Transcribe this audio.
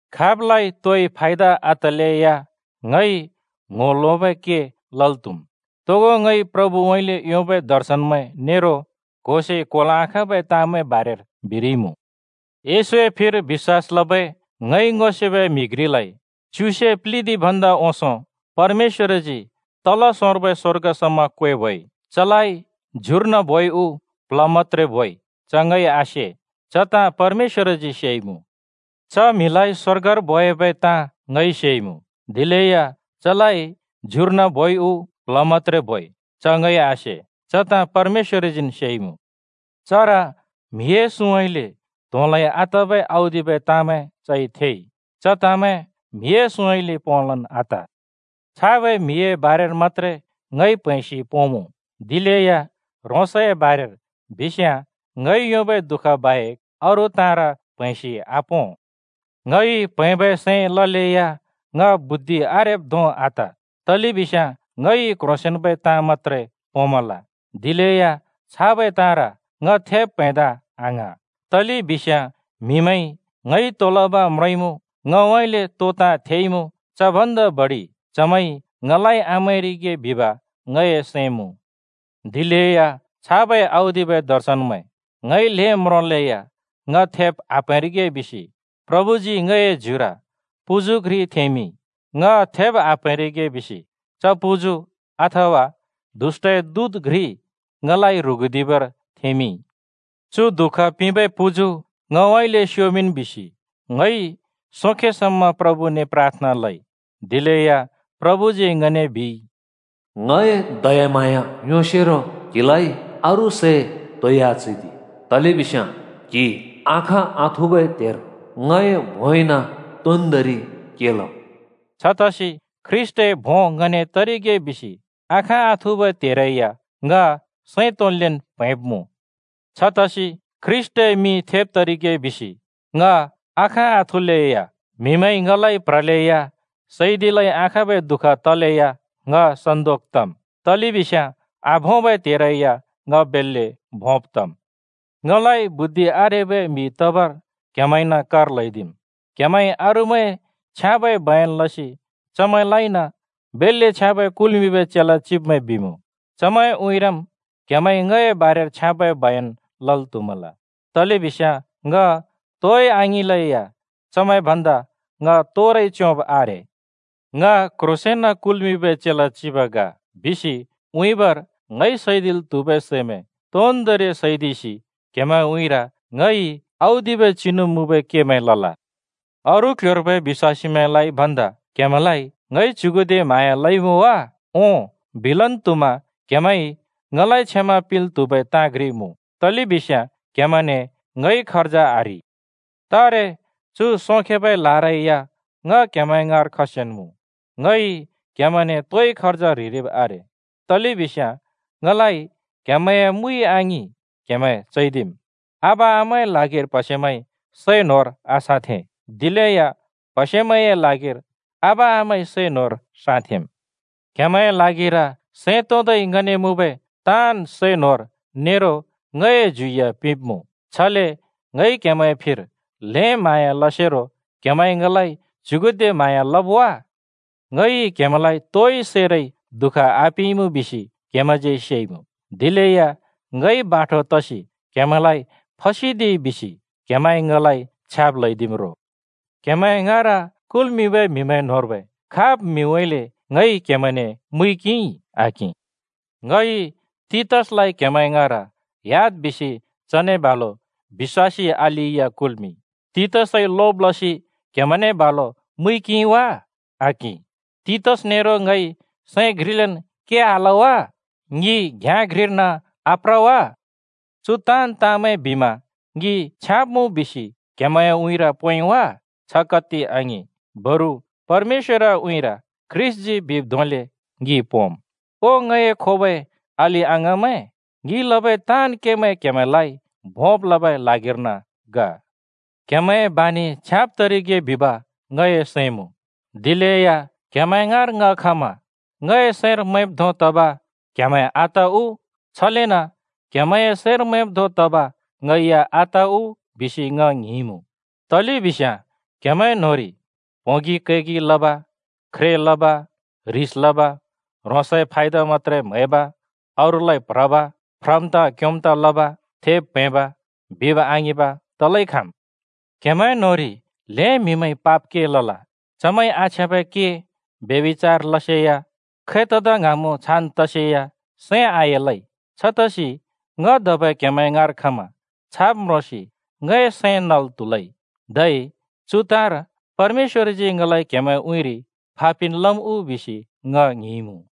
खाबलाइ तोइ फायदा आतलेया ङइ ङ्‍हो लोंबै के लल् त्‍हुम्। तोगो ङइ प्रभुउँइँले योंबै दर्शनमैं नेरो क्होसे क्होल् आखाँबै ताँमैंए बारेर बिरिइमुँ। येशूए फिर बिश्‍वास लबै ङइ ङो सेबै म्हि घ्रिलाइ च्युसे प्लिदि भन्दा ओंसों परमेश्‍वरजी तल सोंर्बै स्वर्ग समा क्‍वेबोइ। चलाइ ज्युर्न बोइ उ प्ल्ह मत्‍त्रे बोइ च ङइ आसे, च ताँ परमेश्‍वरजी सेइमुँ। च म्हिलाइ स्वर्गर बोयाबै ताँ ङइ सेइमुँ, दिलेया चलाइ ज्युर्न बोइ उ प्ल्ह मत्‍त्रे बोइ च ङइ आसे, च ताँ परमेश्‍वरजीन् सेइमुँ। चर म्हिए सुँउँइँले त्होंलै आतबै औदिबै ताँमैं चइ थेइ। च ताँमैं म्‍हिए सुँउँइँले पोंलन् आत। छाबै म्‍हिए बारेर मत्‍त्रे ङइ प्‍हैंसि पोंमुँ, दिलेया ह्रोंसए बारेर बिस्याँ ङइ योंबै दुःख बाहेक अरू ताँर प्‍हैंसि आपों। ङइ प्हैंबै सैं ललेया ङ बुद्धि आरेब् धों आत, तलेबिस्याँ ङइ क्ह्रोंसेंन्बै ताँ मत्‍त्रे पोंमल। दिलेया छाबै ताँर ङ थेब् प्‍हैंदा आङ्हाँ। तलेबिस्याँ म्‍हिमैंइ ङइ तो लब म्रोंइमुँ, ङउँइँले तो ताँ थेइमुँ, च भन्दा बडि चमैंइ ङलाइ आमैंरिगे बिब ङए सैं मुँ। दिलेया छाबै औदिबै दर्शनमैं ङइ ल्हें म्रोंलेया ङ थेब् आप्‍हैंरिगे बिसि प्रभुजी ङए ज्युर पुजु घ्रि थेंमिंइ। ङ थेब् आप्हैंरिगे बिसि च पुजु अथबा दुष्‍टए दूत घ्रि ङलाइ ह्रुगुदिबर थेंमिंइ। “चु दुःख पिंबै पुजु ङउँइँले स्‍योमिंन्” बिसि ङइ सोंखे समा प्रभुने प्राथना लइ। दिलेया प्रभुजी ङने बिइ, “ङए दयाम्हाँया योंसेरो क्हिलाइ अरू सै तोइ आचैदि, तलेबिस्याँ क्‍हि आखाँ आथुबै त्हेर ङए भोंइन तोन्दोंरि के लम्।” छतसि ख्रीष्‍टए भों ङने तरिगे बिसि आखाँ आथुबै त्हेरै या ङ सैं तोंन्लेन् प्हैंब्मुँ। छतसि ख्रीष्‍टए मिं थेब् तरिगे बिसि ङ आखाँ आथुलेया, म्‍हिमैंइ ङलाइ प्ह्रलेया, सैदिलै आखाँबै दुःख तलेया ङ सन्‍दोक तम्, तलेबिस्याँ आभोंबै त्हेरै या ङ बेल्‍ले भोंब् तम्। ङलाइ बुद्धि आरेबै म्हि तबर क्‍हेमैंन कर ल्‍हैदिइ। क्‍हेमैंइ अरूमैंए छ्याँबै बयन लसि चमैंलाइन “बेल्‍ले छ्याँबै कुल्मिंबै चेला चिब्मैं” बिमुँ, चमैंए उँइँरम् क्‍हेमैंइ ङए बारेर छ्याँबै बयन लल् त्‍हुमल। तलेबिस्याँ ङ तोइ आङिंलेया चमैं भन्दा ङ तोरै च्‍योंब् आरे। “ङ क्‍ह्रोंसेंन कुल्मिंबै चेला चिब ग” बिसि उँइँबर ङइ सैदिल् त्हुबै सैमैं तोन्दोंरि सैदिसि क्‍हेमैंए उँइँर ङइ औदिबै चिनु मुँबै केमैं लल। अरू क्‍ल्‍ह्‍योर्बै बिश्‍वासीमैंलाइ भन्दा क्‍हेमैंलाइ ङइ च्युगुदे म्हाँया लइमुँ वा? ओं, बिलन् त्हुमा क्हेमैंइ ङलाइ क्षमा पिंल् त्हुबै ताँ घ्रि मुँ, तलेबिस्याँ क्हेमैंने ङइ खर्ज आह्रि! तारे चु सोंखेबै लारै या ङ क्‍हेमैं ङाँर खसिन्मुँ। ङइ क्‍हेमैंने तोइ खर्ज ह्रिरिब आरे, तलेबिस्याँ ङलाइ क्‍हेमैंए मुइ आङिं क्‍हेमैं चैदिम्। आबा-आमाए ल्हागिर प्‍हसेमैंइ सै न्होर आसाँथें, दिलेया प्‍हसेमैंए ल्हागिर आबा-आमामैंइ सै न्होर साँथेंम्। क्‍हेमैंए ल्हागिर सैं तोंदै ङने मुँबै ताँन् सै न्होर नेरो ङए ज्यु या पिंब्मुँ। छले ङइ क्‍हेमैंए फिर ल्हें म्हाँया लसेरो क्‍हेमैंइ ङलाइ च्युगुदे म्हाँया लब् वा? ङइ क्‍हेमैंलाइ तोइ सैरै दुःख आपिंइमुँ बिसि क्हेमैंज्यै सेइमुँ। दिलेया ङइ बाठो तसि क्हेमैंलाइ फसदिइ बिसि क्हेमैंइ ङलाइ छ्याब् ल्‍हैदिम् रो। क्हेमैं ङाँर कुल्‍मिंबै म्हिमैं न्होंर्बै खाब् म्हिउँइँले ङइ क्हेमैंने मुइ किंइ? आकिं। ङइ तीतसलाइ क्हेमैं ङाँर ह्‍याद् बिसि चने बालु बिश्‍वासी अलि या कुल्‍मिंइ। तीतसइ लोब लसि क्हेमैंने बालु मुइ किंइ वा? आकिं। तीतस नेरो ङइ सैं घ्रिलेन् के आल वा? ङि घ्याँ घ्रिर्न आप्र वा? चु ताँन् ताँमैं बिमा ङि छ्याँब् मुँ बिसि क्हेमैंए उँइँर पोंइ वा? छ कत्ति आङिं! बरु परमेश्‍वरए उँइँर ख्रीष्‍टजी बिब् धोंले ङि पोंम्। ओ ङए खोबै अलि-अङाँमैं, ङिइ लबै ताँन् केमैं क्‍हेमैंलाइ भोंब् लमिंबै ल्हागिर्न ग। क्‍हेमैंए बानि छ्याँब तरिगे बिब ङए सैं मुँ। दिलेया क्‍हेमैं ङाँर ङ खमा ङए सैंर मैंब् धों तब क्‍हेमैं आत उ, छलेन क्‍हेमैंए सैंर मैंब् धों तब ङै या आत उ बिसि ङ ङ्हिंइमुँ। तलेबिस्याँ क्‍हेमैं न्होंरि प्होंगि कैगि लब, ख्रे लब, ह्रिस लब, ह्रोंसए फायदा मत्‍त्रे म्‍हैब, अरूलाइ प्ह्रब, फ्रम् ताँ क्‍योंम् ताँ लब, थेब् प्हैंब, बिब् आङिंब तलै खाँम्। क्‍हेमैं न्‍होंरि ल्हें म्हिइ पाप केमैं लल, चमैंइ आछ्याँबै के, ब्यभिचार लसेया, खै तदा ङ्हाँमुँ छान् तसेया सैं आएलै। छतसि ङ धबै क्‍हेमैं ङाँर खमा छाब् म्रोंसि ङए सैं नल् त्हुलै, धै चु ताँर परमेश्‍वरजी ङलाइ क्‍हेमैंए उँइँरि फा पिन् लम् उ बिसि ङ ङ्हिंइमुँ।